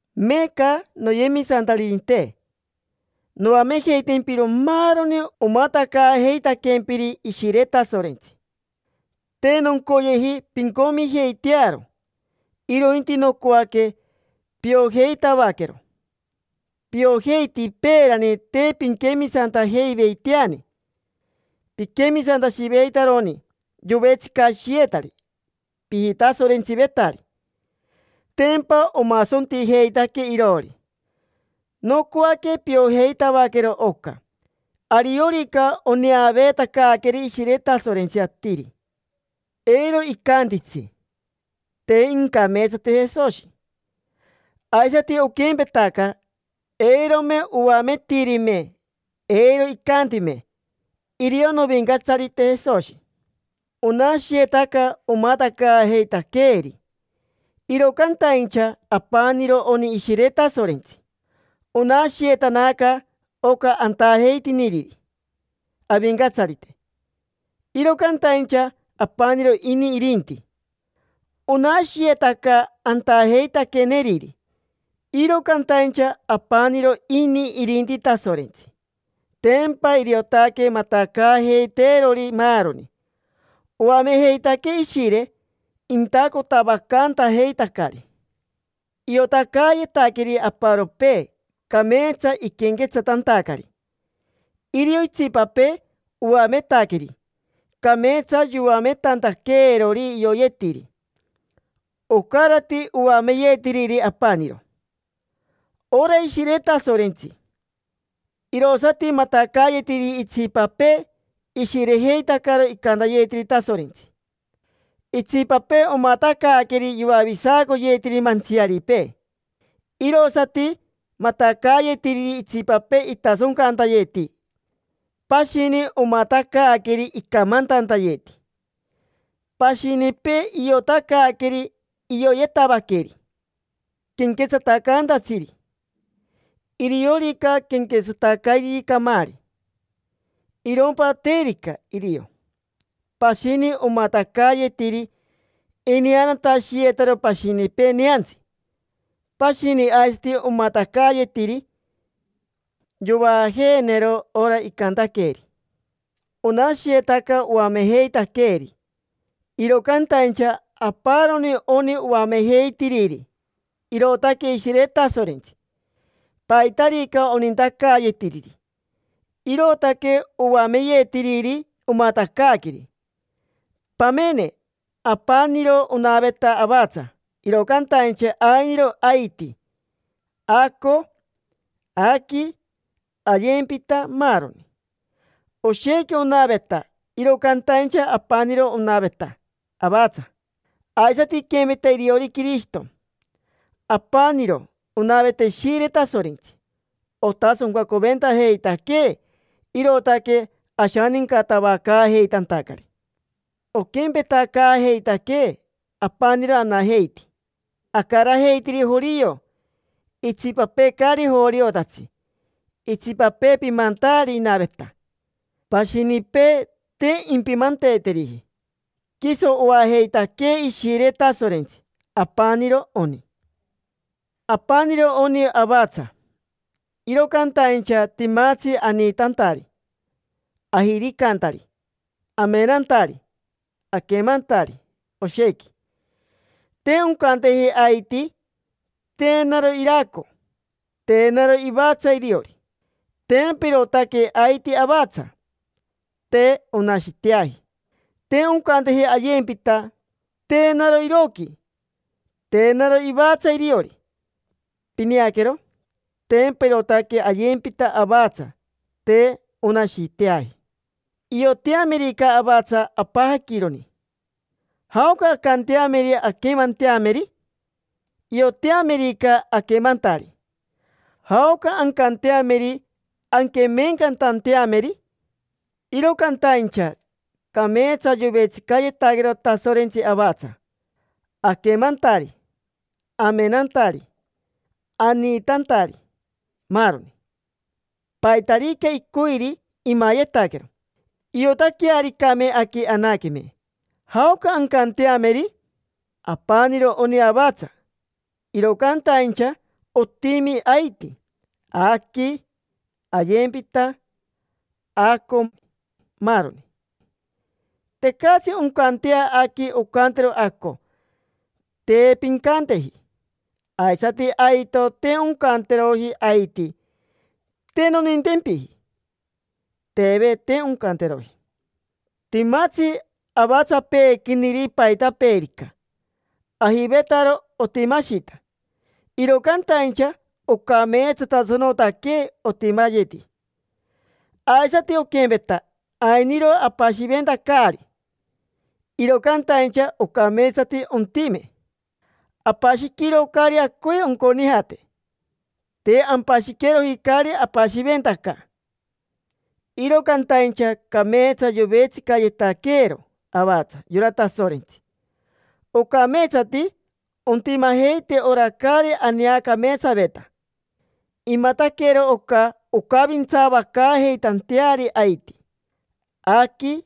Meeca, noyemisantaririnte, noamejeitempiro maaroni omatacaajeitaquempiri Ishire Tasorentsi. Te noncoyeji pincomijeitearo, irointi nocoaque piojeitavaquero. Piojeiti peerani te pinquemisantajeiveiteani. Piquemisantashiyeveitaroni povetsicashiyetari, pijitasorentsivetari. Tempa omasontijeitaque iroori. Nocoaque piojeitavaquero oca. Ariorica oneaveetacaaqueri Ishire Tasorentsi atiri, eiro icantitsi: “Te incameetsateji Jesoshi”. Aisati oquempetaca, eirome oametirime, eiro icantime: “Irio novincatsarite Jesoshi”. Onashiyetaca omatacaajeitaqueeri, iro cantaincha apaniro oni Ishire Tasorentsi. Onashiyetanaca oca antajeitiniriri Avincatsarite, iro cantaincha apaniro ini irinti. Onashiyetaca antajeitaqueneriri, iro cantaincha apaniro ini irinti Tasorentsi. Tempa iriotaque matacaajeiteerori maaroni. Oamejeitaquee Ishire intacotavacantajeitacari. Iotacaayetaqueri aparopee, cameetsa iquenquetsatantacari; irio itsipapee oametaqueri, cameetsa yoametantaqueerori ioyetiri. Ocarati oameyetiriri apaniro: ora Ishire Tasorentsi. Irosati matacaayetiriri itsipapee ishirejeitacaro icantayetiri Tasorentsi; itsipapee omatacaaqueri yoavisacoyetiri mantsiaripee. Irosati matacaayetiriri itsipapee itasoncantayeti. Pashini omatacaaqueri icamantantayeti. Pashinipee iotacaaqueri ioyetavaqueri quenquetsatacaantatsiri: iriorica quenquetsatacairiri camaari, irompa terica irio. Pashini, omatacaayetiri ineanatashiyetaro pashinipee neantsi. Pashini aisati omatacaayetiri yovaajeenero ora icantaqueeri. Onashiyetaca oamejeitaqueri, iro cantaincha aparoni oni oamejeitiriri: irootaque Ishire Tasorentsi. Paitarica onintacaayetiriri, irootaque oameyetiriri, omatacaaqueri. Pamene: apaniro onaveta avatsa, iro cantaincha ainiro aiti, aco, aqui, ayempita, maaroni. Oshequi onaveta, iro cantaincha apaniro onaveta avatsa. Aisati iquempeta iriori Quirishito. Apaniro onaveta Ishire Tasorentsi. Otasoncacoventajeitaquee, irootaque ashanincatavacaajeitantacari, oquempetacaajeitaquee apaniro anajeiti. Acarajeitiri jorio, itsipapee caari joriotatsi; itsipapee pimantaari inaveta, pashinipee te impimanteeteriji. Quiso oajeitaquee Ishire Tasorentsi: apaniro oni. Apaniro oni avatsa, iro cantaincha timatsi aniitantari, ajiricantari, amenantari, aquemantari, oshequi. Te oncanteji aiti: “Te naro iraco, te naro ivatsa iriori”. Tempa irootaque aiti avatsa, te onashiteaji. Te oncanteji ayempita: “Te naro iroqui, te naro ivatsa iriori”. Pineaquero, tempa irootaque ayempita avatsa, te onashiteaji. Ioteamerica avatsa apajaquironi, ¿jaoca ancanteameri anquemanteameri? Ioteamerica aquemantari, ¿jaoca ancanteameri anquemeencatanteameri? Iro cantaincha cameetsa yovetsicayetaquero Tasorentsi avatsa: aquemantari, amenantari, aniitantari, maaroni. Paitarica icoiri, imayetaquero. Iotaquearicame aqui anaqueme, ¿jaoca ancanteameri? Apaniro oni avatsa, iro cantaincha otimi aiti, aqui, ayempita, aco, maaroni. Tecatsi oncantea aqui oncantero aco: “Te pincanteji”. Aisati aito, te oncanteroji aiti: “Te nonintempiji”. Teve, te oncanteroji. Timatsi avatsapeequiniri paitapeerica, ajivetaro otimashita, iro cantaincha ocameetsatasanotaque otimayeti. Aisati oquempeta, ainiro apashiventacari, iro cantaincha ocameetsati ontime. Apashiquiro caari acoi onconijate. Te ampashiqueroji caari apashiventaca. Iro cantaincha cameetsa yovetsicayetaquero avatsa yora Tasorentsi. Ocameetsati ontimajeite ora caari aneacameetsaveta. Imataquero oca oncavintsavacaajeitanteari aiti, aqui,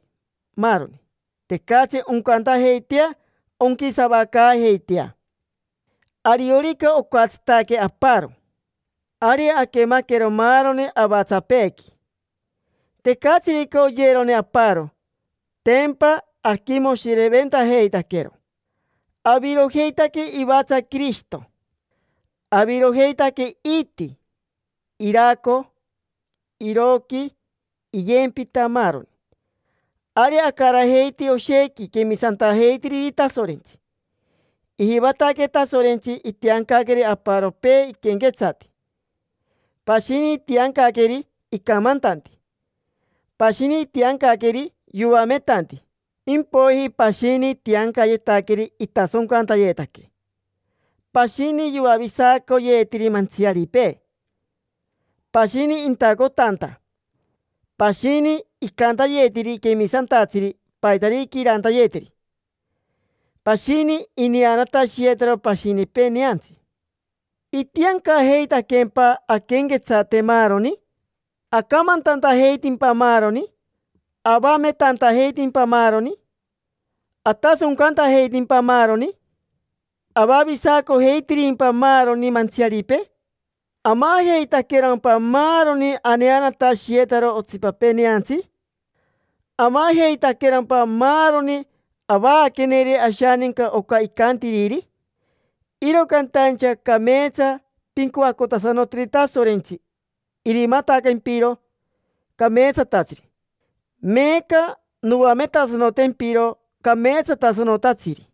maaroni. Tecatsi oncantajeitea onquisavacaajeitea. Ariorica ocatsitaque aparo, ari aquemaquero maaroni avatsapeequi. Tecatsirica oyerone aparo, tempa aquimoshireventajeitaquero. Avirojeitaque ivatsa Quirishito. Avirojeitaque iiti, iraco, iroqui, iyempita, maaroni. Ari acarajeiti oshequi quemisantajeitiriri Tasorentsi. Ijivataque Tasorentsi itiancaqueri aparopee iquenquetsati. Pashini itiancaqueri icamantanti. Pashini itiancaqueri yoametanti. Impoiji pashini itiancayetaqueri itasoncantayetaque, pashini yoavisacoyetiri mantsiaripee, pashini intacotanta, pashini icantayetiri quemisantatsiri paitarica irantayeteri, pashini ineanatashiyetaro pashinipee neantsi. ¿Itiancajeitaqueempa anquenquetsate maaroni? ¿Acamantantajeitimpa maaroni? ¿Avametantajeitimpa maaroni? ¿Atasoncantajeitimpa maaroni? ¿Avavisacojeitirimpa maaroni mantsiaripee? ¿Amajeitaquerompa maaroni aneanatashiyetaro otsipapee neantsi? ¿Amajeitaquerompa maaroni avaaqueneri ashaninca oca icantiriri? Iro cantaincha cameetsa pincoacotasanoteri Tasorentsi irimatacayempiro cameetsatatsiri. Meeca noametasanotempiro cameetsatasanotatsiri.